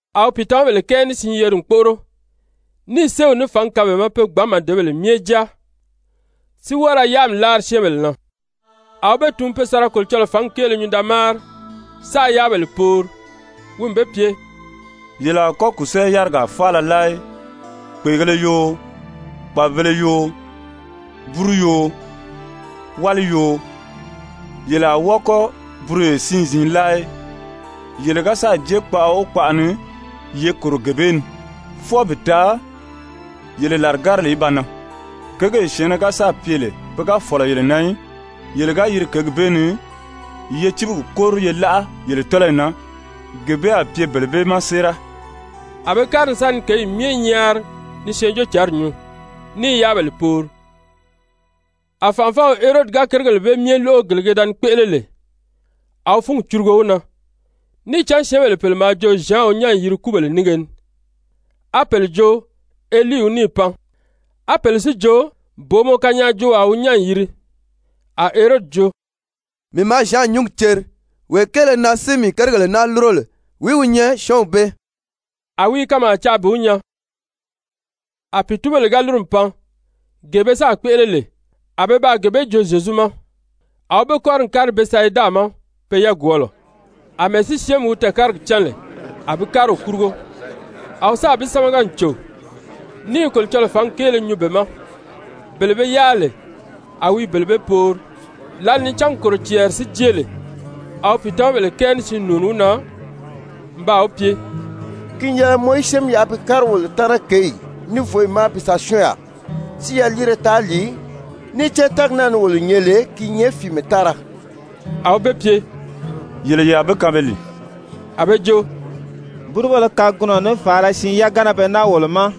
A wi pìitamabèle kɛɛ ní siin yeri n kpóʔoro, níì séew ní fǎngi kaan be ma pe gbǎn màdebèle myɛ jáa, si wɔ́ɔ ra yáami láari syɛ́ɛnbèle na. A wi be tun pe sa ra Kolocɔlɔɔ fǎngi kéele nyuu da máari, sáā yáabèle poori. Wi n be pye: «Yele a kɔ́ kùsɛɛ-yárigaa faala láa í, kpèegēle yoo, kpàbibēle yoo, búru yoo, wáli yoo, yele a wɔ́ɔ kɔ́ buroyo siin-ziin láa í. Yele ga sáà jée kpaʔa o kpaʔa ni, ye kòro gee bee ni fwɔɔ bi taa yele làrigárili í ba nan. Kěgee syɛ̀ɛnnɛ ga sáà pye lè pe ga fɔ̀lɔ yele na í, yele ga yiri kěgi bee ni, ye cíbigi kóri ye láʔa yele tɔ́lɔyi na, gee bee a pye bele bee ma séera.» A be kári n sa ni kěyi myɛ nyaari ni Syɛɛnjóocǎnri nyuu, ní i yáabèle poori. A fànʔafɔw Herodi ga kérigèle bee myɛ lóʔo gele ke da ni kpéʔele lè, a wi fúngi curugo wi na, níì cán syɛ́ɛnbèle pèle maa jo Zyan wi nyán n yiri kúbèle nínge ni, á pèle jo Elii wi níì pan, á pèle si jo booma kanyaajoowaa wi nyán n yìri. A Herodi jo: «Mii maa Zyan nyǔngi ceri. Wee kéele na si mii kérigèle naa lúro lè, wìí wi nyɛ syɔ́ɔnw bee?» A wi i kanmaa caa bi wi nyaa. A pìitunbèle ga lúru n pan, gee be sáà kpéʔele lè, a pe baa gee bee joo Zyezu ma. A wi be kɔ́ri n kári Bɛtisayida ma pe yagwɔɔlɔ. Amɛɛ si syɛ́ɛnmi wi tɛɛ̀kárigi cán lè, a bi kári wi kurugo. A wi sáà bi sámaga n cò, ní i Kolocɔlɔɔ fǎngi kéele nyuu be ma. Bele be yáa lè, a wi i bele bee poori. Lǎli ni cángi kòro cɛɛri si jée lè, a wi pìitamabèle kɛɛ ní siin nùuni wi na n baa wi pye: «Ki n yɛlɛ mɔ í syɛ́ɛnmi yaʔa bi kári wolo taana kěyi, ní vǒyi ma bi sa syɔ́ɔn yaà, si yaliire taa lìi, níì cán tɛ́ɛgi naa ni wolo nyɛ lè, ki i nyɛ fìímɛ tára.» A wi be pye: «Yele ye a be kaan be lìi.» A be jo: «Búrubéle kagunɔ ní fàala siin yagana be naa wolo ma,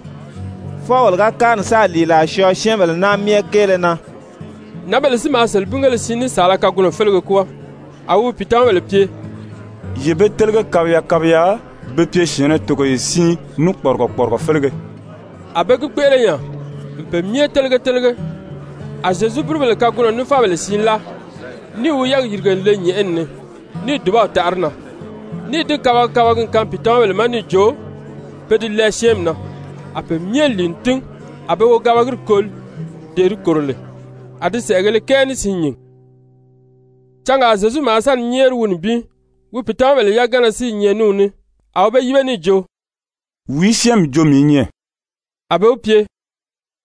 fwɔɔ wolo ga kári n sáà lìilaa syɔɔ syɛ́ɛnbèle naa myɛ kéele na.» Nǎnbèle si maa selebingéle siin ní saala kagunɔ félege kwɔ́ɔ. A wi wi pìitamabèle pye: «Ye be télege kabiya kabiya be pye syɛ̀ɛnnɛ togoye siin ní kpɔrigɔ kpɔrigɔ félege.» A be gi kpéʔele nya n pe myɛ télege télege. A Zyezu búrubèle kagunɔ ní fábèle siin láa, níì wi yɛ́ɛgi yìrige n le nyɛ̀ʔɛni ni níì dùbaw taʔa di na, níì di kabagi kabagi n kaan pìitamabèle ma níì jo pe di lɛɛ syɛ́ɛnmi na. A be myɛ lìi n tín, a be wogabagiri koli, dee di kòro lè, a di sɛ̀ʔɛgēle kɛɛ ní siin nyìn. Cangaa Zyezu maa sa ni nyɛ́ɛri wi nibin, wi pìitamabèle yagana si i nyɛ ní wi ní. A wi be yíbe níì jo: «Wìí syɛ́ɛnmi jo mii i nyɛ?» A be wi pye: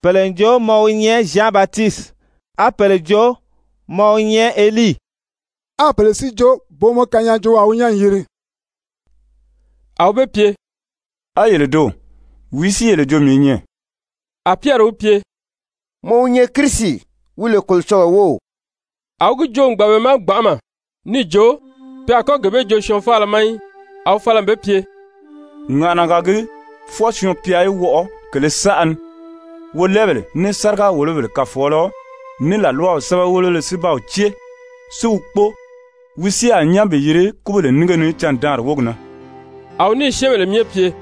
«Pèle n jo mɔ wi nyɛ Zyan Batisiti, á pèle jo mɔ wi nyɛ Elii, á pèle si jo booma kanyaajoowaa wi nyán n yìri.» A wi be pye: «A yele doò, wìí si yele jo mii i nyɛ?» A Pyɛri wi pye: «Mɔ wi nyɛ Kirisi, wi lè Kolocɔlɔɔ wów.» A wi gi joo n gbàn be ma gbanʔama níì jo, pe a kɔ́ gee bee joo syɔɔn faala ma í. A wi fala n be pye: «Ŋàʔanaga gii fwɔɔ Syɔɔn-pya í wɔʔɔ kèlē saʔa ni, wolɛɛbèle, ní sáriga-wòlobèle kàfɔɔlɔ, ní làlwaw sɛ́bɛwelebéle si ba wi cée, si wi kpóo. Wi si a nyán bi yiri kúbèle nínge ni candaanri wógi na.» A wi níì syɛ́ɛnbèle myɛ pye: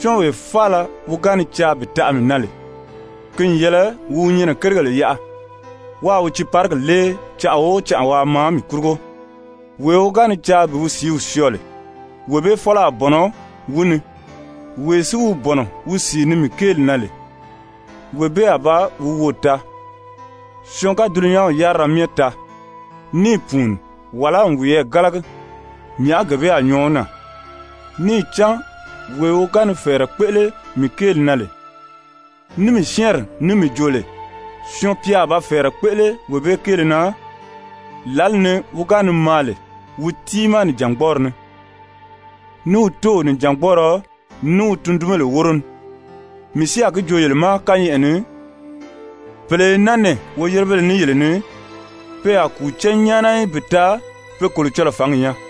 «Syɔ́ɔnwee faala wi ga ni caa bi taʔa mii na lè, ki n yɛlɛ wi wi nyɛnɛ kérigèle yaʔa, wáā wi tiiparigi lée canʔa o canʔa waa maa mii kurugo. Wee wi ga ni caa bi wi sìíw syɔɔ lè, wee bee fɔ́lɔ a bɔ̀nɔ wi ni, wee si wi bɔ̀nɔ wi sìi ni mii kéeli na lè, wee bee a ba wi woò taa. Syɔɔn ga dulunyanw yárira myɛ taa, níì pùuni wàlá n wiyɛɛ gálagi, nyàʔá gee bee a nyɔɔ wi na? Níì cán wee wi ga ni fɛ̀ɛrɛ kpéʔele mii kéeli na lè, ní mii syɛ́ɛnri ní mii joo lè, Syɔɔn-pya a ba fɛ̀ɛrɛ kpéʔele wee bee kéele na lǎli ni wi ga ni maa lè wi tiimaa nìjangbɔɔri ni, ní wi Tóow nìjangbɔɔrɔ, ní wi tundunjanbèle wóro ní. Mii si a gi joo yele ma kányɛʔɛ ni, pèle i naa nɛɛ woyérebéle ní yele ni, pe a kùu cán nyáana í bi taa pe Kolocɔlɔɔ fǎngi nyaa.»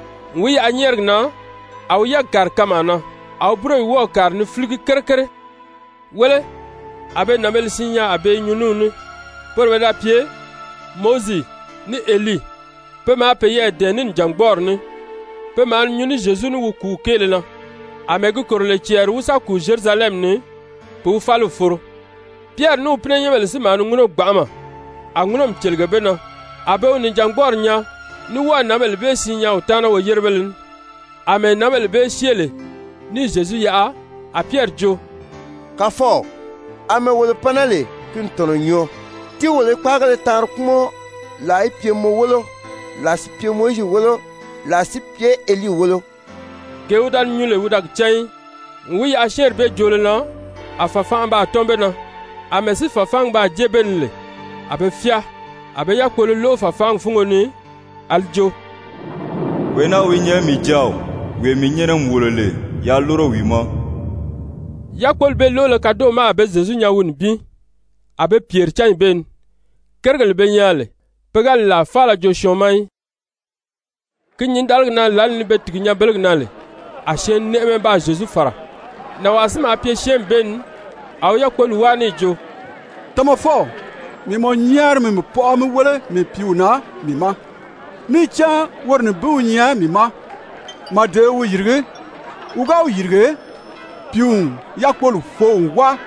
N wi yaʔa nyɛ́ɛrigi na, a wi yɛ́ɛgi kàri kanmaa na, a wi búroyi wɔ́ɔ̀ kàri ni fíligi kere kere. Wéle, a be nànbēle siin nyaa a be i nyuu ní wi ní, poro pe da pye Mowizi ní Elii. Pe maa peyɛɛ dɛ̀ɛn ní nìjangbɔɔri ní, pe maa ni nyuu ní Zyezu ní wi kùúw kéele na, àmɛɛ gi kòro lè cɛɛri wi sa kùu Zyerusalɛmi ni bi wi fáliw foro. Pyɛri ní wi pínɛnyɛnbèle si maa ni ŋúnɔ gbanʔama, a ŋúnɔmi cèlege be na. A be wi nìjangbɔɔri nyaa ní wɔ́ɔ̀ nǎnbèle bee siin nyaa wi taana woyérebéle ní. Amɛɛ nǎnbèle bee syée lè níì Zyezu yaʔa, a Pyɛri jo: «Kàfɔw, àmɛɛ wolo pan naa lè, ki n tɔ̀nɔ n nyɔɔ, tíi wolo í kpáagéle taanri kpúmɔn, làa í pye mɔ wólo, làa si pye Mowizi wólo, làa si pye Elii wólo.» Gee wi da ni nyuu lè wi da gi cán í. N wi yaʔa syɛ́ɛnri bee joolo na, a fàfanʔa baa tɔ́n be na, àmɛɛ si fàfaangi baa jée be ni lè, a be fyáa. A be yákpolo lóʔo fàfaangi fúngo ni a li jo: «Wee naa wi nyɛ mii Jáaw, wee mii nyɛ́nɛ n wòlo lè, yaa lúro wi ma.» Yákpoli bee lóʔolo kadoʔo ma a be Zyezu nyaa wi nibin. A be pyèri cányi bee ni, kérigèle be nyaa lè, pe ga li làa faala joo syɔɔn ma í. Ki nyǐndaligi na lǎli ni be tìgi nyanbelegi na lè, a syɛɛnnɛʔɛmɛ baa Zyezu fàra. Nànwaa si maa pye syɛ́ɛnmi bee ni, a wi yákpoli wáa níì jo: «Tamafɔw, mii i mɔ nyɛ́ɛri mi mii pɔʔɔ mí wéle mii pìíw na mii ma, níì cán woro nibin wi nyɛ mii ma. Màdeo i wi yìrigí, wi ga wi yìrige, pìíw n yákpoli foo n wáa,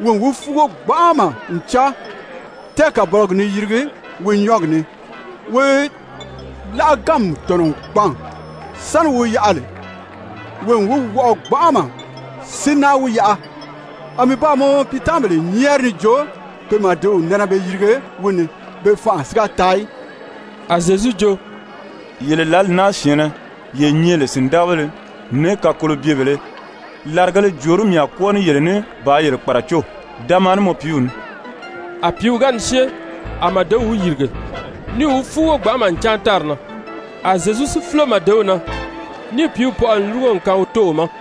wi n wi fúugo gbanʔama n cáan, tɛ́ɛkabɔlɔgi n ni yirigi wi nyɔ́ɔgi ni, wi láʔaganmi n tɔ̀nɔ n gbàn, sáni wi wi yaʔa lè, wi n wi wɔʔɔ gbanʔama, si náa wi yaʔa. A mii baa mɔ piitamabèle nyɛ́ɛri níì jo pe màdew nɛnɛ be yirige wi ni, be fanʔa si ga taa í.» A Zyezu jo: «Yele lǎli naa syɛ̀ɛnnɛ, ye nyɛ lè sìndagabéle ní kakolobyebèlē, làrigēle jòorí mii a kwɔ́ɔ ní yele ní bàā yele kpàracó? Da maa ní mɔ piiw ní.» A pìíw ga ni syée, a màdew wi yìrige, níì wi fúugo gbanʔama n cáan tári na. A Zyezu si fúlo màdew na, níì pìíw pɔʔɔ n lúrugo n kaan wi tóow ma.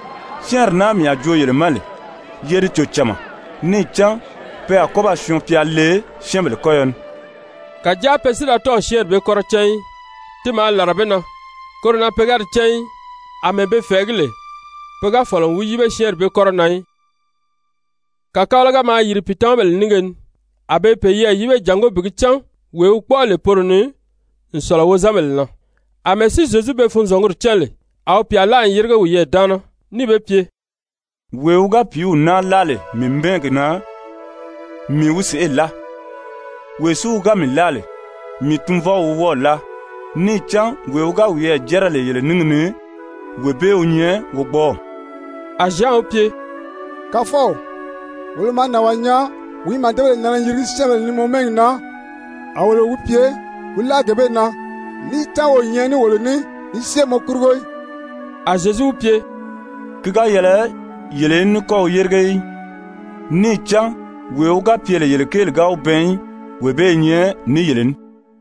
«Syɛ́ɛnri naa mii a joo yele ma lè, ye di cò cama, níì cán pe a kɔ́ ba Syɔɔn-pya le syɛ́ɛnbèle kɔ́yɔ ni.» Kàjáa pe si da tɔ́ɔ̀ syɛ́ɛnri bee kɔ́rɔ cán í. Ti maa làra be na, koro na pe ga di cán í. Amɛɛ be fɛ̀ɛgí lè, pe ga fɔ̀lɔ n wi yíbe syɛ́ɛnri bee kɔ́rɔ na í. Wìí wi kpɔ́ʔɔ n sɔ̀lɔ wo ni? Kàkabalaga maa yìri pìitamabèle nínge ni, a be i peyɛɛ yíbe jàngó bi gi cán wee wi kpɔ́ʔɔ lè poro ni n sɔ̀lɔ wozanbèle na. Amɛɛ si Zyezu pe funzɔnguri cán lè, a wi pyà láa n yérige wiyɛɛ daana, níì be pye: «Wee wi ga pìíw naa láa lè mii mɛ́ɛgi na, mii wi sèʔê láa. Wee si wi ga mii láa lè, mii Tunvɔw wi wɔ́ɔ̀ láa. Níì cán wee wi ga wiyɛɛ jɛ́rɛ lè yele níngi ni, wee bee wi nyɛ wogbɔɔw.» A Zyan wi pye: «Kàfɔw, wolo maa nànwaa nyaa wi i màdebèle nɛnɛ ni yirigi syɛ́ɛnbèle ni mɔ mɛ́ɛgi na. A wolo wi pye wi láʔa gee bee na, níì cán wi o nyɛ ní wolo ní ni syée mɔ kurugo í.» A Zyezu wi pye: «Ki ga yɛlɛ yele í ní kɔ́ wi yérige í. Níì cán wee wi ga pye lè yele kéeli ga wi bɛɛn í, wee bee i nyɛ ní yele ní.»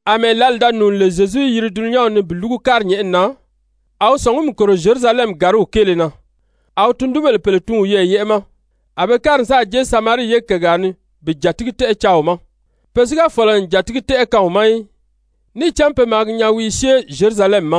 Amɛɛ lǎli da nùuni lè Zyezu í yiri dulunyanw ni bi lúgu kári nyɛ̀ʔɛni na, a wi sɔ̀ngumi kòro Zyerusalɛmi gàriw kéele na. A wi tundunbèle pèle tun wiyɛɛ yɛ́ʔɛ ma. A be kári n sáà jée Samarii ye kègaa ni bi jàtigi-tɛ́ʔɛ caa wi ma. Pe si ga fɔ̀lɔ n jàtigi-tɛ́ʔɛ kaan wi ma í, níì cán pe maa gi nyaa wi i syée Zyerusalɛmi ma.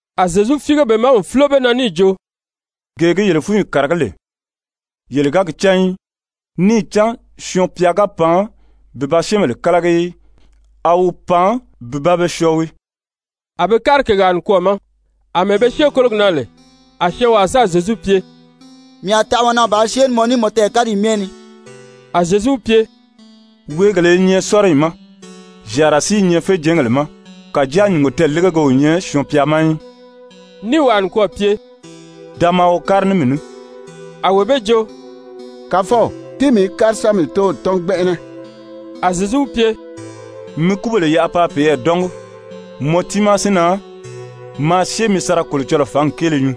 A Zyezu fíige be ma n fúlo be na níì jo: «[Gee gi yele fúnyi kàragí lè, yele ga gi cán í. Níì cán Syɔɔn-pya ga pan bi ba syɛ́ɛnbèle kálagi í, a wi pan bi ba be syɔɔ wii.]» A be kári kègaa nikwɔɔ ma. Amɛɛ be syée kólogi na lè, a syɔɔnwaa sáà Zyezu pye: «Mii a taʔa mɔ na bàā syée ní mɔ ní mɔ tɛɛ̀káriyi myɛ ni.» A Zyezu wi pye: «Weegèlē i nyɛ sɔ́riyi ma, zyàara si i nyɛ féjɛɛngèle ma, kàjáa nyùngo tɛɛ̀légege o nyɛ Syɔɔn-pya ma í,» níì wàa nikwɔɔ pye: «Da maa wo kári ní mii ní.» A wee bee jo: «Kàfɔw, tíi mii í kári sa mii tóow tɔ́n gbɛnʔɛnɛ.» A Zyezu wi pye: «Mi kúbèle yaʔa paa peyɛɛ dɔ́ngi. Mɔ tiimaa si na, maa syée mi sa ra Kolocɔlɔɔ fǎngi kéele nyuu.»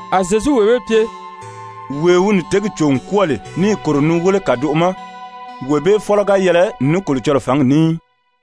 A Zyezu wee bee pye: «Wee wi nìtěgi cò n kwɔ́ɔ lè níì kòro ni wéle kàdoʔo ma, wee bee fɔ́lɔ ga yɛlɛ ní Kolocɔlɔɔ fǎngi ní í.»